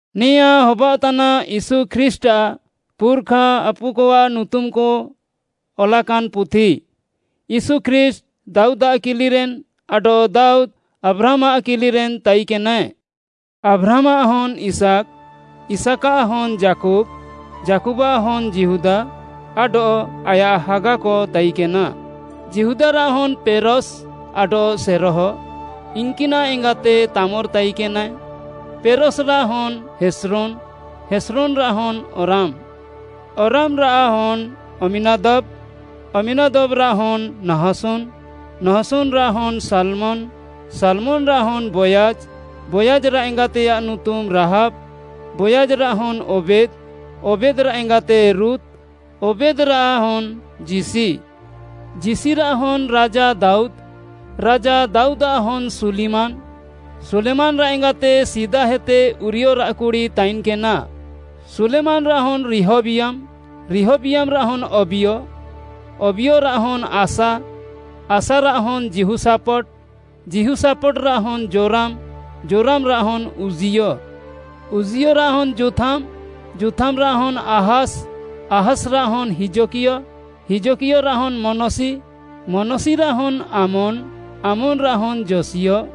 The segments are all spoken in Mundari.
ନେଆଁଁ ହବାଅଃତାନା ୟୀଶୁ ଖ୍ରୀଷ୍ଟ୍‌ଆଃ ପୁର୍‌ଖା ଆପୁକଆଃ ନୁତୁମ୍‌କ ଅଲାକାନ୍‌ ପୁଥି, ୟୀଶୁ ଖ୍ରୀଷ୍ଟ୍‌, ଦାଉଦ୍‌ଆଃ କିଲିରେନ୍‌ ଆଡଃ ଦାଉଦ୍‌, ଆବ୍ରାହାମ୍‌ଆଃ କିଲିରେନ୍‌ ତାଇକେନାଏ। ଆବ୍ରାହାମ୍‌ଆଃ ହନ୍‌ ଇସାକ୍‌, ଇସାକ୍‌ଆଃ ହନ୍‌ ଯାକୁବ୍‌, ଯାକୁବ୍‌ଆଃ ହନ୍‌ ଯିହୁଦା ଆଡଃ ଆୟାଃ ହାଗାକ ତାଇକେନା, ଯିହୁଦାରାଃ ହନ୍‌ ପେରସ୍‌ ଆଡଃ ସେରହ, ଇନ୍‌କିନାଃ ଏଙ୍ଗାତେ ତାମର୍‌ ତାଇକେନାଏ, ପେରସ୍‌‌ରାଃ ହନ୍‌ ହେସ୍ରୋନ୍‌, ହେସ୍ରୋନ୍‌ରାଃ ହନ୍‌ ଅରାମ୍‌, ଅରାମ୍‌ରାଃ ହନ୍‌ ଅମ୍ମୀନାଦବ୍‌, ଅମ୍ମୀନାଦବ୍‌ରାଃ ହନ୍‌ ନହଶୋନ୍‌, ନହଶୋନ୍‌ରାଃ ହନ୍‌ ସାଲ୍‌ମନ୍‌, ସାଲ୍‌ମନ୍‌ରାଃ ହନ୍‌ ବୋୟାଜ୍‌, ବୋୟାଜ୍‌ରାଃ ଏଙ୍ଗାତେୟାଃ ନୁତୁମ୍‌ ରାହାବ୍‌, ବୋୟାଜ୍‌ରାଃ ହନ୍‌ ଓବେଦ୍‌, ଓବେଦ୍‌ରାଃ ଏଙ୍ଗାତେ ରୁତ୍‌, ଓବେଦ୍‌ରାଃ ହନ୍‌ ଯିଶି, ଯିଶିରାଃ ହନ୍‌ ରାଜା ଦାଉଦ୍‌, ରାଜା ଦାଉଦାଃ ହନ୍‌ ସୁଲିମାନ୍‌, ସୁଲିମାନ୍‌ରାଃ ଏଙ୍ଗାତେ ସିଦାହେତେ ଉରିୟରାଃ କୁଡ଼ି ତାଇନ୍‌କେନା, ସୁଲିମାନ୍‌ରାଃ ହନ୍‌ ରିହବିୟାମ୍‌, ରିହବିୟାମ୍‌ରାଃ ହନ୍‌ ଅବିୟ, ଅବିୟରାଃ ହନ୍‌ ଆସା, ଆସାରାଃ ହନ୍‌ ଯିହୋଶାଫତ୍‌, ଯିହୋଶାଫତ୍‌ରାଃ ହନ୍‌ ଯୋରାମ୍‌, ଯୋରାମ୍‌ରାଃ ହନ୍‌ ଉଜ୍ଜିୟ, ଉଜ୍ଜିୟରାଃ ହନ୍‌ ଯୋଥାମ୍‌, ଯୋଥାମ୍‌ରାଃ ହନ୍‌ ଆହାସ୍‌, ଆହାସ୍‌ରାଃ ହନ୍‌ ହିଜକିୟ, ହିଜକିୟରାଃ ହନ୍‌ ମନଶି, ମନଶିରାଃ ହନ୍‌ ଆମୋନ୍‌, ଆମୋନ୍‌ରାଃ ହନ୍‌ ଯୋଶିୟ,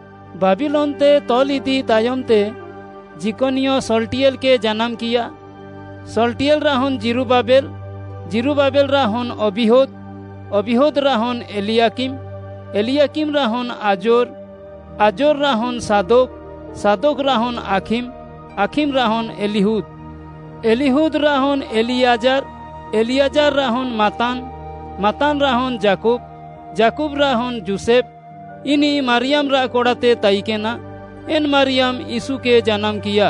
ବାବିଲୋନ୍‌ତେ ତଲ୍‌ଇଦି ତାୟମ୍‌ତେ ଯିକନିୟ ଶଲ୍‌ଟିୟେଲ୍‌କେ ଜାନାମ୍‌କିୟା, ଶଲ୍‌ଟିୟେଲ୍‌ରାଃ ହନ୍‌ ଜିରୁବାବେଲ୍‌, ଜିରୁବାବେଲ୍‌ରାଃ ହନ୍‌ ଅବିହୁଦ୍‌, ଅବିହୁଦ୍‌ରାଃ ହନ୍‌ ଏଲିୟାକିମ୍‌, ଏଲିୟାକିମ୍‌ରାଃ ହନ୍‌ ଆଜୋର୍‌, ଆଜୋର୍‌ରାଃ ହନ୍‌ ସାଦୋକ୍‌, ସାଦୋକ୍‌ରାଃ ହନ୍‌ ଆଖିମ୍‌, ଆଖିମ୍‌ରାଃ ହନ୍‌ ଏଲିହୁଦ୍‌, ଏଲିହୁଦ୍‌ରାଃ ହନ୍‌ ଏଲିୟାଜାର୍‌, ଏଲିୟାଜାର୍‌ରାଃ ହନ୍‌ ମାତ୍ତାନ୍‌, ମାତ୍ତାନ୍‌ରାଃ ହନ୍‌ ଯାକୁବ୍‌, ଯାକୁବ୍‌ରାଃ ହନ୍‌ ଯୋଷେଫ୍‌, ଇନିଃ ମାରିୟାମ୍‌ରାଃ କଡ଼ାତେ ତାଇକେନା, ଏନ୍‌ ମାରିୟାମ୍‌ ୟୀଶୁକେ ଜାନାମ୍‌କିୟା,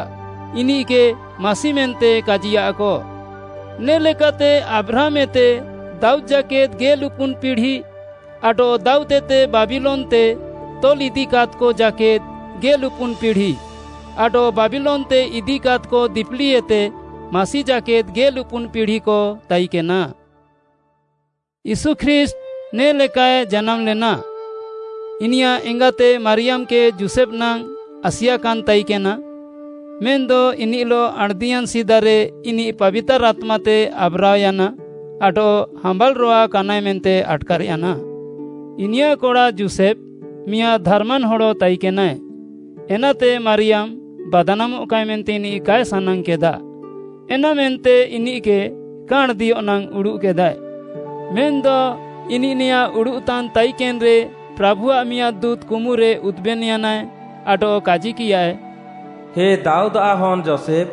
ଇନିଃକେ ମାସି ମେନ୍ତେ କାଜିୟାଃକ। ନେ ଲେକାତେ ଆବ୍ରାହାମ୍‌ଏତେ ଦାଉଦ୍‌ ଜାକେଦ୍‌ ଗେଲ୍‌ଉପୁନ୍‌ ପିଢ଼ି, ଆଡଃ ଦାଉଦ୍‌ଏତେ ବାବିଲୋନ୍‌ତେ ତଲ୍‌ଇଦିକାଦ୍‌କ ଜାକେଦ୍‌ ଗେଲ୍‌ଉପୁନ୍‌ ପିଢ଼ି, ଆଡଃ ବାବିଲୋନ୍‌ତେ ଇଦିକାଦ୍‌କ ଦିପିଲିଏତେ ମାସି ଜାକେଦ୍‌ ଗେଲ୍‌ଉପୁନ୍‌ ପିଢ଼ିକ ତାଇକେନା। ୟୀଶୁ ଖ୍ରୀଷ୍ଟ୍‌ ନେ ଲେକାଏ ଜାନାମ୍‌ଲେନା। ଇନିୟାଃ ଏଙ୍ଗାତେ ମାରିୟାମ୍‌କେ ଯୋଷେଫ୍‌ ନାଙ୍ଗ୍‌ ଆସିଆକାନ୍‌ ତାଇକେନା। ମେନ୍‌ଦ ଇନିଃଲଃ ଆଣ୍‌ଦିୟାନ୍‌ ସିଦାରେ ଇନିଃ ପାବିତାର୍‌ ଆତ୍ମାତେ ଆବ୍‌ରାଅୟାନା ଆଡଃ ହାମ୍ବାଲ୍‌ରୋୱା କାନାଏ ମେନ୍ତେ ଆଟ୍‌କାର୍‌ୟାନା। ଇନିୟାଃ କଡ଼ା ଯୋଷେଫ୍‌ ମିଆଁଦ୍‌ ଧାର୍‌ମାନ୍‌ ହଡ଼ ତାଇକେନାଏ, ଏନାତେ ମାରିୟାମ୍‌ ବାଦ୍‌ନାମଃକାଏ ମେନ୍ତେ ଇନିଃ କାଏ ସାନାଙ୍ଗ୍‌କେଦା, ଏନାମେନ୍ତେ ଇନିଃକେ କା ଆଣ୍‌ଦିୟଃ ନାଙ୍ଗ୍‌ ଉଡ଼ୁଃକେଦାଏ। ମେନ୍‌ଦ ଇନିଃ ନେଆଁଁ ଉଡ଼ୁଃତାନ୍‌ ତାଇକେନ୍‌ରେ ପ୍ରାଭୁଆଃ ମିଆଁଦ୍‌ ଦୁଁତ୍‌ କୁମୁରେ ଉଦୁବେନ୍‌ୟାନା ଆଡଃ କାଜିକିୟାଏ, “ହେ ଦାଉଦ୍‌ଆଃ ହନ୍‌ ଯୋଷେଫ୍‌,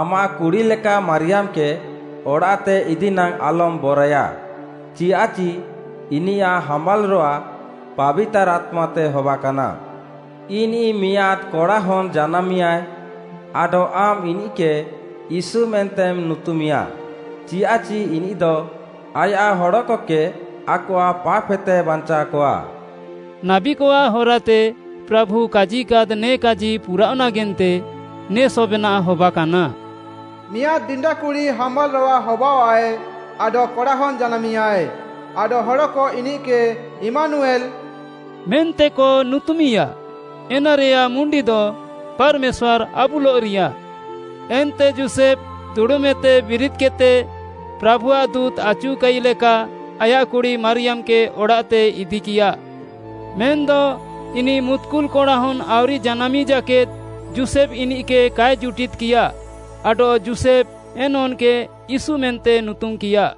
ଆମାଃ କୁଡ଼ି ଲେକା ମାରିୟାମ୍‌କେ ଅଡ଼ାଃତେ ଇଦିନାଙ୍ଗ୍‌ ଆଲମ୍‌ ବରଏୟା, ଚିୟାଃଚି ଇନିୟାଃ ହାମ୍ବାଲ୍‌ରୋୱା ପାବିତାର୍‌ ଆତ୍ମାତେ ହବାକାନା। ଇନିଃ ମିଆଁଦ୍‌ କଡ଼ାହନ୍‌ ଜାନାମିଁୟାଏ, ଆଡଃ ଆମ୍‌ ଇନିଃକେ ୟୀଶୁ ମେନ୍ତେମ୍‌ ନୁତୁମିଁୟା, ଚିୟାଃଚି ଇନିଃଦ ଆୟାଃ ହଡ଼କକେ ଆକଆଃ ପାପ୍‌ହେତେ ବାଞ୍ଚାଅକଆ।” ନାବୀକଆଃ ହରାତେ ପ୍ରାଭୁ କାଜିକାଦ୍‌ ନେ କାଜି ପୁରାଅଃ ନାଗେନ୍ତେ ନେ ସବେନାଃ ହବାକାନା, “ମିଆଁଦ୍‌ ଡିଣ୍ଡାକୁଡ଼ି ହାମ୍ବାଲ୍‌ରୋୱା ହବାଅଃଆଏ ଆଡଃ କଡ଼ାହନ୍‌ ଜାନାମିଁୟାଏ, ଆଡଃ ହଡ଼କ ଇନିଃକେ ଇମ୍ମାନୁୟେଲ୍‌” ମେନ୍ତେକ ନୁତୁମିଁୟା, ଏନାରେୟାଃ ମୁଣ୍ଡିଦ, “ପାର୍‌ମେଶ୍ୱାର୍‌ ଆବୁଲଃରିୟା।” ଏନ୍ତେ ଯୋଷେଫ୍‌ ଦୁଡ଼ୁମ୍‌ଏତେ ବିରିଦ୍‌କେଦ୍‌ତେ, ପ୍ରାଭୁଆଃ ଦୁଁତ୍‌ ଆଚୁକାଇ ଲେକା ଆୟାଃ କୁଡ଼ି ମାରିୟାମ୍‌କେ ଅଡ଼ାଃତେ ଇଦିକିୟା। ମେନ୍‌ଦ ଇନିଃ ମୁତ୍‍କୁଲ୍‌ କଡ଼ାହନ୍‌ ଆଉରି ଜାନାମିଁ ଜାକେଦ୍‌ ଯୋଷେଫ୍‌ ଇନିଃକେ କାଏ ଜୁଟିଦ୍‍କିୟା। ଆଡଃ ଯୋଷେଫ୍‌ ଏନ୍‌ ହନ୍‌କେ ୟୀଶୁ ମେନ୍ତେ ନୁତୁମ୍‌କିଆ।